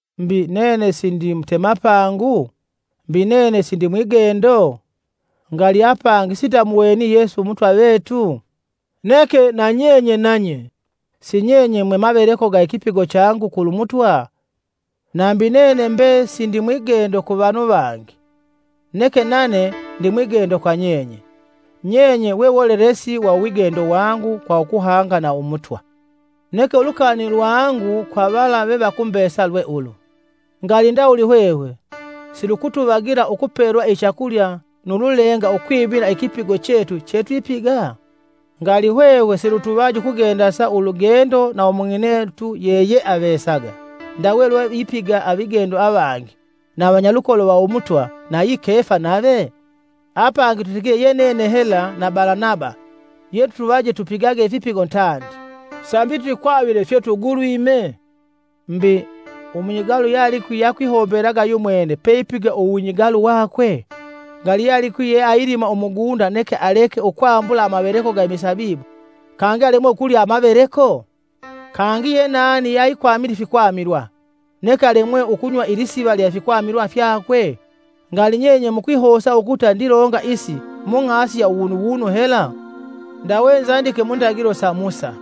Mbi, nene sindi mutemapangu? Mbi nene sindimwigendo? Ngali apangi sindamuweni Yesu umutwa vetu? Neke nanyenye nanye, sinyenye mwe maveleko ga ikipigo changu kulu Mutwa?. Nambi nene mbe sindi mwigendo ku vanu vangi, neke nane ndi mwigendo kwa nyenye. Nyenye wewolelesi wa uwigendo wangu, kwa ukuhanga na umutwa. Neke ulukani lwangu kwa vala vevakumbesa lwe ulu: Ngali ndawuli hwehwe silukutuvagila ukupelwa ichakulya nu lulenga ukwimila ikipigo chetu chetwipiga? Ngali hwehwe silutuvaji ukugendasa ulugendo na umung'inetu yeyeavesaga ndawe lwevipiga avigendo avangi na avanyalukolo va umutwa, nayi Kefa nave? Apangi tutigile ye nene hela na Balanaba yelutuvaje tupigage ifipigo tandi, sambi twikwavile fyetugulwime? Mbi, umunyigalu yalikwi akwihombelaga yumwene peipigila uwunyigalu wakwe? Ngali yealikwi yeayilima umugunda neke aleke ukwambula amaveleko ga imisabibu kangi alemwe ukulya amaveleko? Kangi yenani yeaikwamila ifikwamilwa, neke alemwe ukunywa ilisiva lya ifikwamilwa fyakwe? Ngali nyenye mukwihosa ukuta ndilonga isi mung'asi ya uwunuwunu hela? Ndawe nzandike mu ndagilo sa Musa,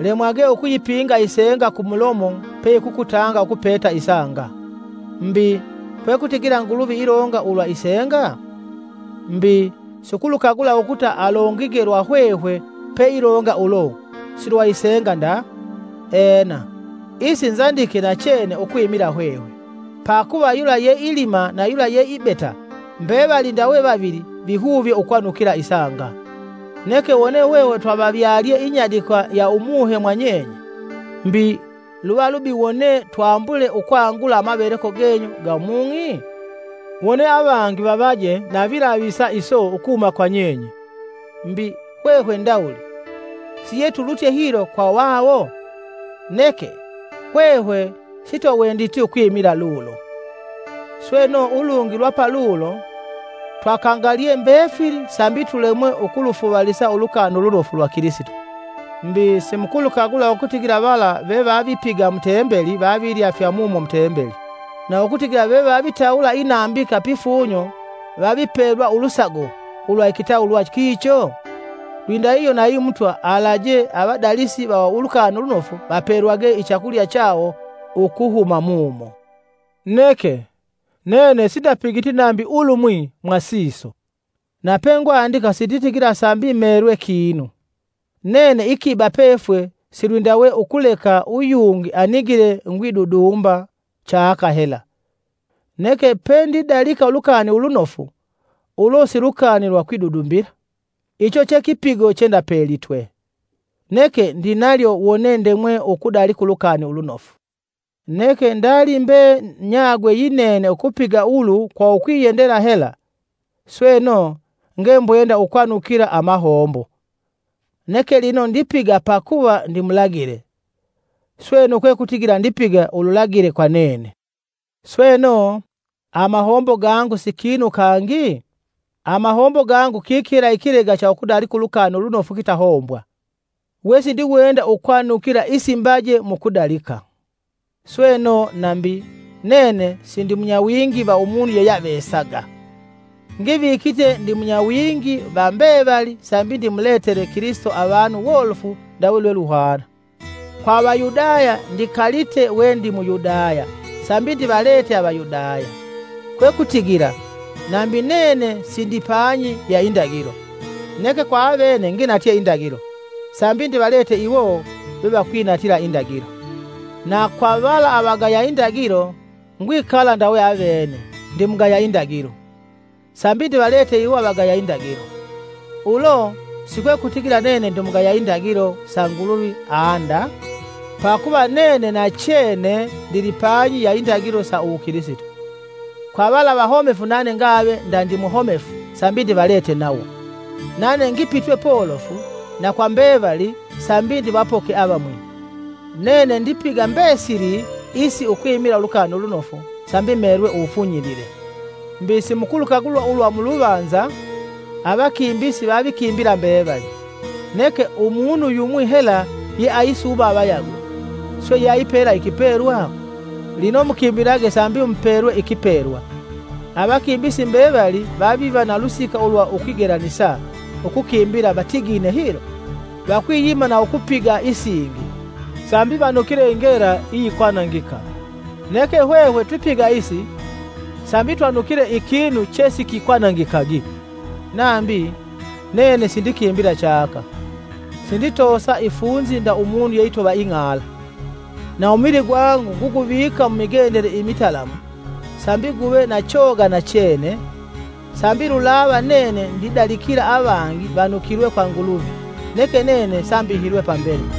“Lemwage ukuyipinga isenga kumulomo peyikukutanga ukupata isanga.” Mbi, kwekutigila Nguluvi ilonga ulwa isenga? Mbi, siukulukagula ukuta alongige lwa hwehwe peilonga ulo, silwa isenga nda. Ena, isi nzandike nachene ukwimila hwehwe; pakuva yula yeilima na yula yeibeta, mbevali ndawe vavili vihuvye ukwanukila isanga. Neke wone hwehwe twavavyalye inyadikwa ya Umuhe mwa nyenye, mbi, luva lubi wone twambule ukwangula amaveleko genyu ga mung'i? Wone avangi vanoje na vilavisa iso ukuhuma kwa nyenye, mbi, hwehwe ndawuli siyetulutye hilo kwa vawo? Neke, hwehwe sitwawenditi ukwimila lulo. Sweno ulungi lwa palulo, twakangalye mbefili sambi tulemwe ukulufuvalisa Ulukani Ulunofu lwa Kilisito. Mbi, simukulukagula ukutigila vala vevavipiga mu Tembeli vavilya fya mumo mu Tembeli, na ukutigila vevavitawula inambika pifunyo vavipelwa ulusago ulwa ikitawulwa kicho? Lwindahihyo nayi Mutwa alaje avadalisi va Ulukani Ulunofu vapelwage ichakulya chawo ukuhuma mumo. Neke, nene sindapigiti nambi ikimwi mwa siso. Na pengwandika sinditigila sambi melwe kinu, nene ikiba pefwe silwindawe ukuleka uyungi anigile ngwidudumba chaka hela. Neke pendidalika Ulukani Ulunofu, ulo si lukani lwa kwidudumbila, icho che kipigo chendapelitwe. Neke ndinalyo wone ndemwe ukudalika Ulukani Ulunofu! Neke ndalimbe nyagwe yinene ukupiga ulu kwa ukwiyendela hela, sweno, ngembwenda ukwanukila amahombo; neke lino ndipiga pakuva ndimulagile, sweno kwekutigila ndipiga ululagile kwa nene. Sweno, amahombo gangu si kinu kangi? Amahombo gangu kiki hela ikilega cha ukudalika Ulukani Ulunofu kitahombwa, we sindiwenda ukwanukila isimbaje mu kudalika. Sweno, nambi, nene sindi munyawingi va umunu yeyeavesaga, ngivikite ndi munyawingi va mbevali sambi ndimuletele Kilisito avanu wolofu ndawe lweluhwana. Kwa Avayudaya ndikalite we ndi mu Yudaya sambi ndivalete Avayudaya, kwekutigila, nambi nene sindipanyi ya Indagilo, neke kwa avene nginatye Indagilo, sambi ndivalete iwo vevakwinatila Indagilo. Na kwa vala avagaya Indagilo, ngwikala ndawe avene, ndimugaya Indagilo, sambi ndivalete iwo avagaya indagilo. Ulo si kwekutigila nene ndimugaya Indagilo sa Nguluvi aa nda, pakuva nene nachene ndilipanyi ya Indagilo sa uwukilisito. Kwa vala avahomefu nane ngave nda ndimuhomefu sambi ndivalete nawo. Nane ngipitwe polofu na kwa mbevali sambi ndivapoke avamwi. Nene ndipiga mbesili isi ukwimila Ulukani Ulunofu, sambi melwe uwufunyilile. Mbi, simukulukagula ulwa muluvanza, avakimbisi, vavikimbila mbevali, neke umunu yumwi hela yeaisuuma avayagwe swe yeaipelwa ikipelwa? Lino mukimbilage sambi mupelwe ikipelwa. Avakimbisi mbevali vaviva na ulusika ulwa ukwigelanisa ukukimbila vatigine hilo, vakwiyima na ukupiga isingi; sambi vanukile ikinu iyikwanangika! Neke hwehwe twipiga isi sambi twanukile ikinu chesikikwanangikagi. Nambi, nene sindikimbila chaka, sinditoosa ifunzi nda umunu yeitova ing'ala; Na umuvili gwangu nguguvika mumigendele imitalamu sambi guve na choga nachene, sambi lulava nene ndidalikila avangi vanukilwe kwa Nguluvi neke nene sambihilwe pambele.